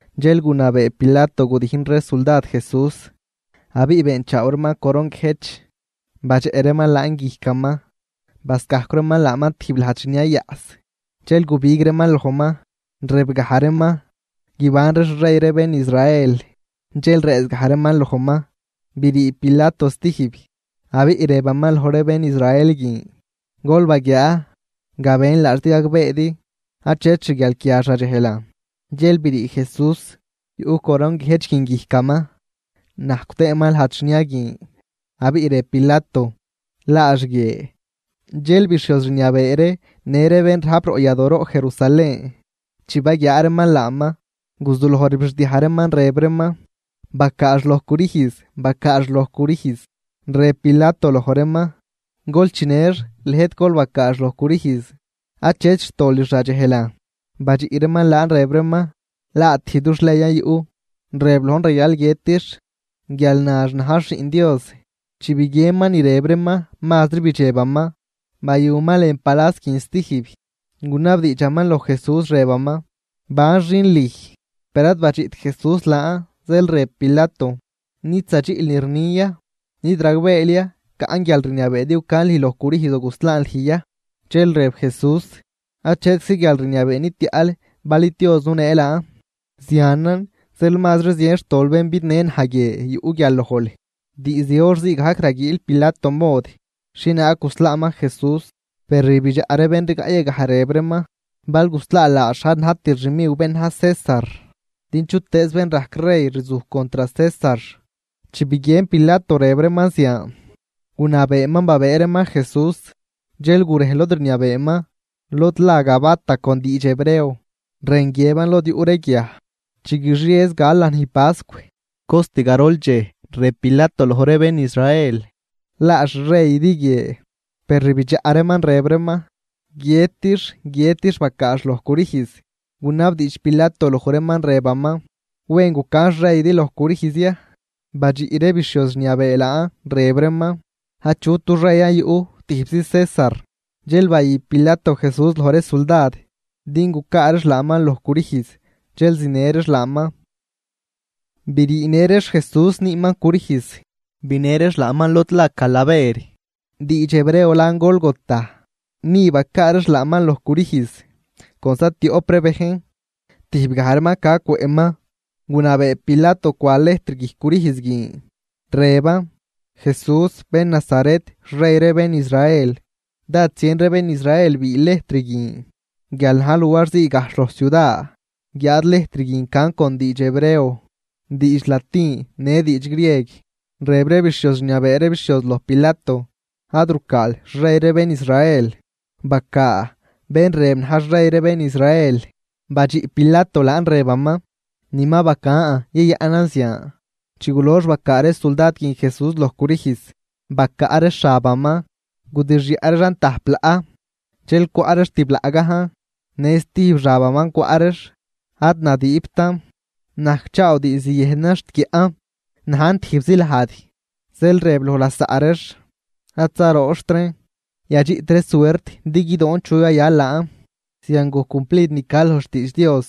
Dxel gunabee Pilato gudijn ree suldad Jesús. Abiꞌ beenchaaw reeman coron guiëjch, badxeꞌ reeman laan guijcaman, bascajcw reeman laaman tijb lajd xniayaꞌs. Dxel gubig reeman lojman, rëbgaj reeman: ―¡Guibanri xrey ree bén Israel! Dxel rëëzgaj reeman lojman. Brii Pilato stijb, abiꞌ rëbaman loj ree bén Israel guin: ―Gol baguiaa, gabën laax din gagbeedi, achet xguialquiax radxejlan. Dxel brii Jesús, yuꞌ coron guiëjch guin guijcaman, najcw tëëman lajd xnia guin. Abiꞌ rëb Pilato: ―Laax guie. Dxel bixhioz rniabee ree në ree bén rajp roꞌ yadooroꞌ Jerusalén, chi baguiaa reeman laaman, guzuloj rbixdiaj reeman, rëb reeman: ―¡Bacaax loj crüjz! ¡Bacaax loj crüjz! Rëb Pilato loj reeman: ―Gol chinëx, lëjt gol bacaax loj crüjz, achet xtolix radxejlan. Badxiꞌ reeman laan rëb reeman: ―Laa tijb dux leyan yuꞌ, rëb lojn rayal guiëtix, guial nax najx Xiꞌn Dios. Chi biguienman ni rëb reeman, mazri bidxebaman. Bayuman lën palas guin zatijb, gunabdiidxaman loj Jesús rëbaman: ―¿Ban xin lüj? Per ad badxiꞌt Jesús laan. Zeel rëb Pilato: ―¿Nid zadxiꞌl ni rnin ya? ¿Nid ragbeel ya caꞌn guialrniabee din gucan lüj loj crüjz o guslaan lüj ya? Dxel rëb Jesús: ―Achetczi guialrniabee nitiaꞌl bal id Dios nunee laan. Zianan zeel mazri zien xtol bén bidnë naj guie yuꞌ guial lojl. Diizd hor zii gajc raguiil Pilato mod, xhienaag guslaaman Jesús, per rbidxaꞌ ree bén rigaꞌ yagaj, rëb reeman: ―¡Bal guslaal laax, ad najtil xmiw bén na̱j César! ¡Din chutëëz bén rajc rey rzuj contr César! Chi biguien Pilato rëb reeman zian, gunabeeman babëë reeman Jesús, dxel gurej lod rniabeeman, lod la Gabata con diidx hebreo, rën guiëban Lod yuꞌ ree guiaj. Chi guixiez gal lanij pascw, cost garol dxej rëb Pilato loj ree bén Israel: ―¡Laa xreydi guie! Per rbidxaꞌ reeman rëb reeman: ―¡Guiëtix! ¡Guiëtix! ¡Bacaax loj crüjz! Gunabdiidx Pilato loj reeman, rëbaman: ―¿Wen gucan xreydi loj crüjz ya? Badxiꞌ ree bixhioz rniabee laan, rëb reeman: ―Achut dux reyan yuꞌ, tijbzi César. Dxel bayü Pilato Jesús loj ree suldad din gucaa reex laaman loj crüjz, dxel zinë reex laaman. Briinë reex Jesús, nüüman crüjz, binë reex laaman lod la Calaver, diidx hebreo lan Gólgota. Ni bacaa reex laaman loj crüjz con zatioꞌp ree bejn, tijb gaj reeman ca cwëꞌman. Gunabee Pilato cwa lejtr guijc crüjz guin, rëban: “Jesús bén Nazaret, xrey ree bén Israel.” Dád zien ree bén Israel biil lejtr guin, guial na̱j luar zii gajxh loj ciuda, guiáad lejtr guin can con diidx hebreo, diidx latin në diidx grieg. Rëb ree bixhioz rniabee ree bixhioz loj Pilato: ―Ad rucaal: “Xrey ree bén Israel”, bacaa: “Bén rëb na̱j xrey ree bén Israel.” Badxiꞌ Pilato laan rëbaman: ―Ni ma bacan yayaꞌnan zian. Chi gulox bacaa ree suldad guin Jesús loj crüjz, bacaꞌ reex xabaman, gudixyaꞌ reexan tajp laꞌ, dxel cwaꞌ reex tib laꞌ gajn. Në stijb xabaman cwaꞌ reex, ad nadiibtan, najcchaaw diizd yëjnan xt guiaꞌn, najn tijbzi lajd. Zeel rëb loj lasaꞌ reex: ―Ad zarooxt reen, yadxiꞌt ree suert din guidoon chu yayal laan. Zian gojc cumplid ni ca loj xtiidx Dios,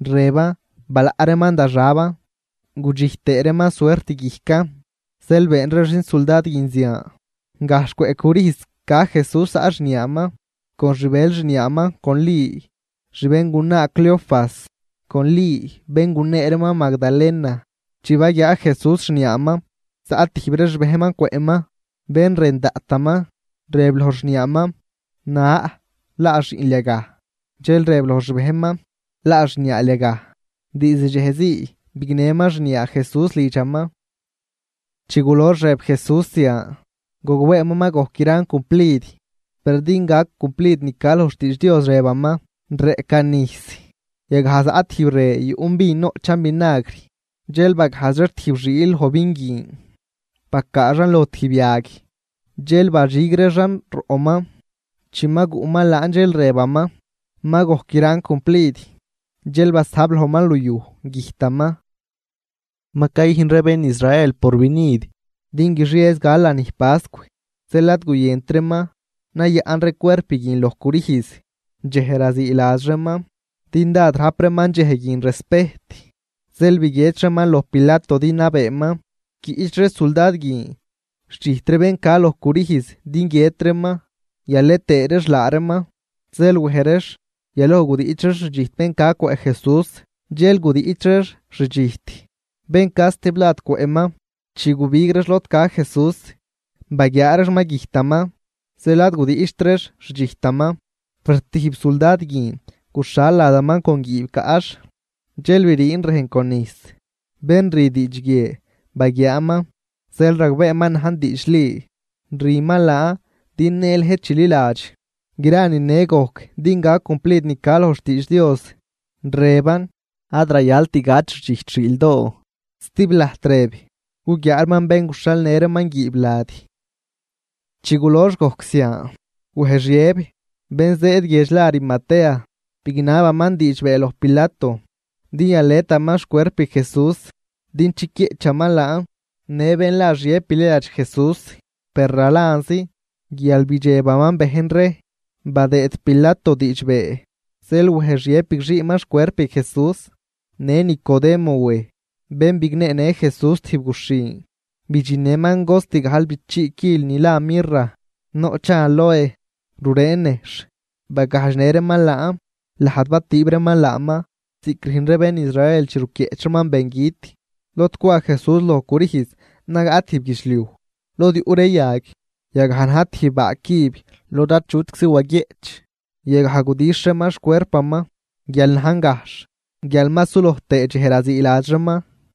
rëban: “Balaꞌ reeman da xaban, gudxijt tëë reeman suert guijcan.” Zeel been ree xinsuldad guin zian. Gajxh cwëꞌ crüjz ca Jesús zaꞌ xniaaman con xbël xniaaman con Li xbéngunaa Cleofas con Li bén gunee reeman Magdalena. Chi baguiaa Jesús xniaaman, zaꞌ tijb ree xbejnman cwëꞌman, bén rën daꞌtaman, rëb loj xniaaman: ―Na, laa xiꞌnl yagaj. Dxel rëb loj xbejnman: ―Laa xniaal yagaj. Diizd dxej zii bignëman xniaa Jesús lidxaman. Chi gulox rëb Jesús zian, gogbeeman ma gojc gran cumplid. Per din gac cumplid ni ca loj xtiidx Dios, rëbaman: ―Reꞌcan nijs. Yagaj zaꞌ tijb re yuꞌn vin noꞌchan vinagr, zeel bagajdx reex tijb xiil loj vin guin, bacaa reexan loj tijb yag, dxel badxig reexan roꞌman. Chi ma guꞌman laan, dxel rëbaman: ―Ma gojc gran cumplid. Dxel basajb lojman luyuj, güjtaman. Ma cayüjn ree bén Israel porvinid din guixiez gal lanij pascw. Zeel ad guyënt reeman nayaꞌn ree cuerp guin loj crüjz dxej raziiladx reeman, din dád rajp reeman dxej guin respejt. Zeel biguiedx reeman loj Pilato din nabeeman quiꞌch ree suldad guin xdxijt ree bén ca loj crüjz din guiët reeman yalet tëë reex laa reeman. Zeel wej reex. Yaloj gudiꞌch reex xdxijt bén ca cwëꞌ Jesús, dxel gudiꞌch reex xdxijt bén ca stiblad cwëꞌman. Chi gubig reex lod ca Jesús, baguiaa reex ma güjtaman, zeel ad gudiꞌcht reex xdxijtaman. Per tijb suldad guin guxhal ladaman con guiib caꞌx, dxel briin rejn con nijs. Bén rü diidx guie baguiaaman, zeel ragbeeman najn diidxli, rüman laan din në lëjt chililadx. Gra nine gojc din gac cumplid ni ca loj xtiidx Dios, rëban: “Ad rayalt gach xdxijt xiildoo.” Stiblajt rëb: “Guguiaa reeman bén guxhalnë reeman guiib lad.” Chi gulox gojc zian, wej Xiëb, bén zëëd guiedx la Arimatea, bignabaman diidxbee loj Pilato din yaletaman xcuerp Jesús din chiquieꞌchaman laaman. Në bén la Xiëb bililadx Jesús, per ralanzi, guial bidxebaman bejn ree. Badëëd Pilato diidxbee, zeel wej Xiëb bigxiiman xcuerp Jesús. Në Nicodemo wej, bén bigneenë Jesús tijb guxhin, bidxinnëman cost gajlbichii quil ni la mirra, noꞌchan aloe, rureen nejxh. Bagajdxnë reeman laan lajd batüüb reeman laaman, ziꞌc rüjn ree bén Israel chi ruquieꞌch reeman bengüt. Lod cwa Jesús loj crüjz nagaꞌ tijb guidxliuj lod yuꞌ ree yag. Yagaj na̱j tijb baa cüb lod achutczi waguieꞌch. Yagaj gudixh reeman xcuerpaman, guial najn gajxh, guial ma suloj tëë dxej raziiladx reeman.